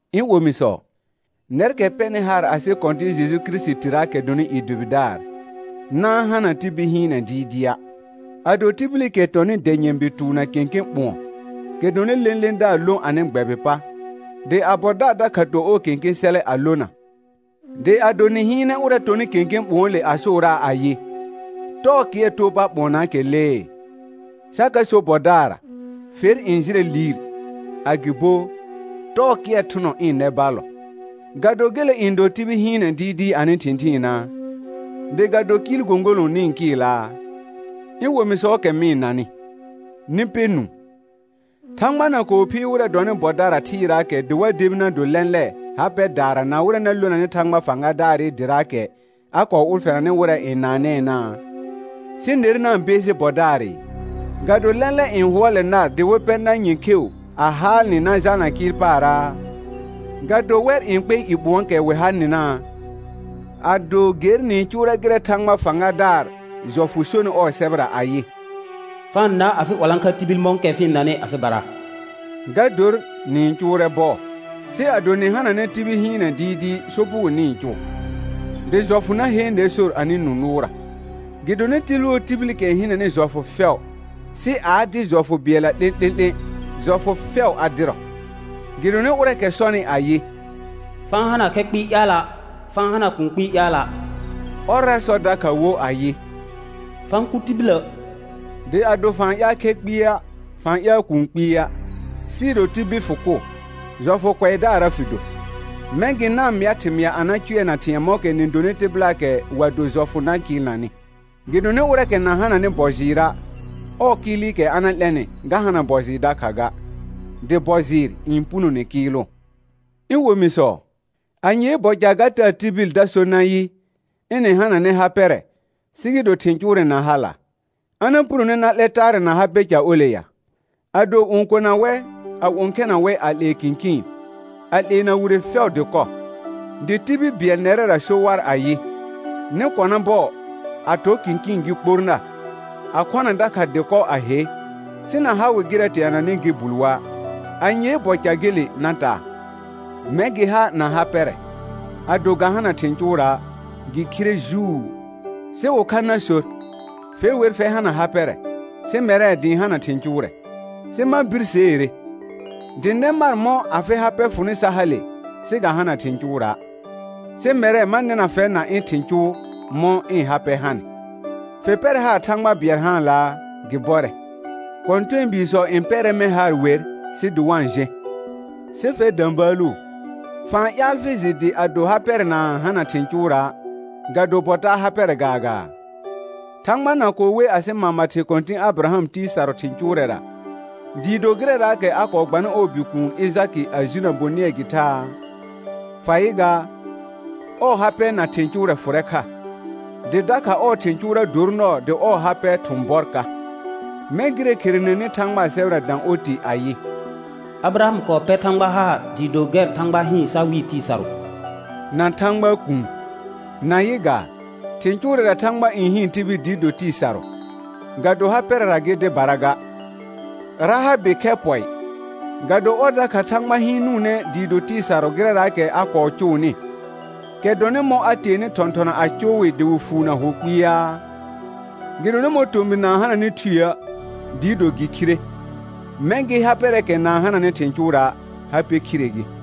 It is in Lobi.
Ɩ̃ omisɔ, nɛrkɛ pɛnɩ haar asɩ Kɔ̃tɩ̃ Jeju Kirisitiraakɛ dɔnɩ i dʋbɩdaar, na-n hana tibil hɩɩnɛ dɩɩdɩa'. Ado tibilikɛ tɔnɩ dɛ nyɛ̃bi tʋʋ na kẽkẽ ɓʋ̃ɔ, kɛ dɔnɩ lẽledaar lõ anɩ gbɛbɩ pa, dɩ a bɔdaar dakha to ɔɔ kẽkẽ sɛlɛ a lona, dɩ ado nɩ hɩɩnɛ ʋrɛ tɔnɩ kẽkẽ ɓʋ̃ɔɔle a sʋʋraa ayɩ: Tɔɔ kɩɛr too pa ɓʋɔnaakɛ lee; sa ka so bɔdaarra: Fer n jɩlɛ liir; agɩbo: Tɔɔ kɩɛr thʋnɔ ɩ̃ nɛ ballɔ. Ga do gele n dɔ tibil hɩɩnɛ dɩɩdɩɩ anɩ thɩ̃thɩɩnaa? Dɩ ga do kɩɩl gõgolõ nɩ-n kɩɩlaa? Ɩ̃ omisɔɔkɛ mɩ-n nanɩ, nɩ pɛ nũu: Thãgba na kɔɔ phiir wɩrɛ dɔnɩ bɔdara thɩɩraakɛ dɩ wa debi na do lɛ̃lɛ ha pɛdaara na wɩrɛ na lonanɩ Thãgba fãgadaarɩ dɩraakɛ a kɔɔ ʋlfɛnanɩ wɩrɛ n naanɛɛnaa? Sɩ ner na-n beesi bɔdaarɩ. Ga do lɛ̃lɛ n hʋɔlɛ nar dɩ wɩ pɛ nar nyɛ̃ kheu a haal nɩ na jalna kɩɩl paarraa? Ga do wɛr n kpɛ i ɓʋ̃ɔɔkɛ wɩ ha nɩnaa? Ado ger nɩ-n cʋʋrɛ gɩrɛ Thãgba fãgadaar jɔfʋ sonɩ ɔɔ sɛbɛra ayɩ: «Fa-n na afɩ 'walãkha tibil mɔ̃kɛ fɩ-n nanɩ afɩbara», ga dor nɩ-n cʋʋrɛ bɔɔ. Sɩ ado nɩ hananɛ tibil hɩɩnɛ dɩɩdɩɩ sopugo nɩ-n cʋʋ, dɩ jɔfʋ na heen ner sor anɩ nũ nʋʋrra. Gɩdonɩ tibil wo tibilikɛ n hɩnɛnɩ jɔfʋ fɛʋ sɩ a a dɩ jɔfʋ bɩɛlla 'lẽ'lẽ'lẽ, jɔfʋ fɛʋ a dɩrɔ. Gɩdonɩ ʋrɛɛkɛ sɔnɩ ayɩ: «Fa-n hana khɛ kpɩɩ ƴaala', fa-n hana kũu kpɩɩ ƴaala'», ɔrra sɔ dakha wo ayɩ: «Fa-n kʋ tibilə'.» Dɩ ado fa-n ƴaal khɛ kpɩa', fa-n ƴaal kũu kpɩa', sɩɩ do tibil fɩ kʋ, jɔfʋ kʋɛdaarra fɩ do. Mɛ̃ gɩ na-n mɩa thɩmɩa a na cʋɛna thɩ̃ɛ mɔ̃kɛ nɩ donɩ tɩbɩlaakɛ wa do jɔfʋ na kɩɩlnanɩ. Gɩdonɩ ʋrɛɛkɛ na hananɩ bɔ jɩɩra', ɔɔ kɩɩlɩkɛ a na 'lɛnɩ ga hana bɔ jɩɩr dakha ga, dɩ bɔ jɩɩr n punone kɩɩlʋ. Ɩ̃ omisɔ, anyee bɔ ca ga taa tibil da so nayɩ, ɩnɩ hananɛ ha pɛrɛ, sɩ gɩ do thɩ̃ cʋʋrɛ na hala'. A na punone na 'lɛ taarɛ na ha pɛ ca ole ya? Ado õkona wɛ, a õkhɛna wɛ a 'lee kɩ̃kɩɩn, a 'leena wire fɛʋ dɩkɔ, dɩ tibil bɩɛl nɛrɛra so war ayɩ: Nɩ kɔna bɔɔ, a tɔ kɩ̃kɩɩn gɩ kpor nar, a khɔna dakha dɩkɔ a he; sɩ na ha wɩ gɩrɛ teananɩ gɩ bul wa', anyee bɔ ca gele na taa? Mɛ̃ gɩ ha na ha pɛrɛ, ado ga hana thɩ̃ cʋʋra', gɩ khire juu. Sɩ ʋkha na sor: Fe wer fɛr hana ha pɛrɛ, sɩ mɛrɛ dɩ ɩ̃ hana thɩ̃ cʋʋrɛ. Sɩ ma birseere: Dɩ nɛ mar mɔ̃ afɩ ha pɛ fʋnɩ sa hale, sɩ ga hana thɩ̃ cʋʋra'. Sɩ mɛrɛ ma nɩna fɛr na ɩ̃ thɩ̃ cʋʋ mɔ̃ ɩ̃ ha pɛ hanɩ. Fɩ pɛrɛ haar Thãgba bɩɛl haanlaa? Gɩ bɔrɛ. Kɔ̃tɛɛbiisɔ n pɛrɛ mɛ̃ haar wer sɩ dɩ wa-n jẽ. Sɩ fɛr də̃bəəlu, fa-n ƴaal fɩ jɩ dɩ ado ha pɛrɛ na-n hana thɩ̃ cʋʋra', ga do bɔ taa ha pɛrɛ gaagaa? Thãgba na kɔɔ we asɩ mama thɩ kɔ̃tɩ̃ Abɩraham tɩɩ sarʋ thɩ̃ cʋʋrɛra, dɩɩ do gɩrɛraakɛ a kɔɔ gbanɩ ɔɔ bikuun Ɩjakɩ a jinə bonɩɛ gɩ thaa? Fa yɩ gaa, ɔɔ ha pɛ na thɩ̃ cʋʋrɛ fʋrɛ kha, dɩ dakha ɔɔ thɩ̃ cʋʋra dor nɔɔ dɩ ɔɔ ha pɛ thʋ̃ bɔr ka. Mɛ̃ gɩrɛ kherenenɩ Thãgbaa sɛbɛra dã oti ayɩ: «Abɩraham kɔɔ pɛr Thãgba haar dɩɩ do gɛr Thãgba hɩɩn sa wɩɩ tɩɩ sarʋ» na Thãgbaa kuun. Na yɩ gaa, thɩ̃ cʋʋrɛra Thãgba n hɩɩn tibil dɩ do tɩɩ sarʋ, ga do ha pɛrɛra gɩ dɩbara ga. Rahabɩ khɛ pɔɩ, ga do ɔr dakha Thãgba hɩɩnʋʋnɛ dɩ do tɩɩ sarʋ gɩrɛraakɛ a kɔɔ cʋʋnɩ, kɛ dɔnɩ mɔ̃ a teenɩ thɔ̃thɔna a cʋʋ wɩ dɩ wɩ fuunə hʋ kpɩaa? Gɩdonɩ mɔ̃ tomɩr na-n hananɩ thueə', dɩɩ do gɩ khire, mɛ̃ gɩ ha pɛrɛɛkɛ na-n hananɩ thɩ̃ cʋʋra', ha pɛ khire gɩ.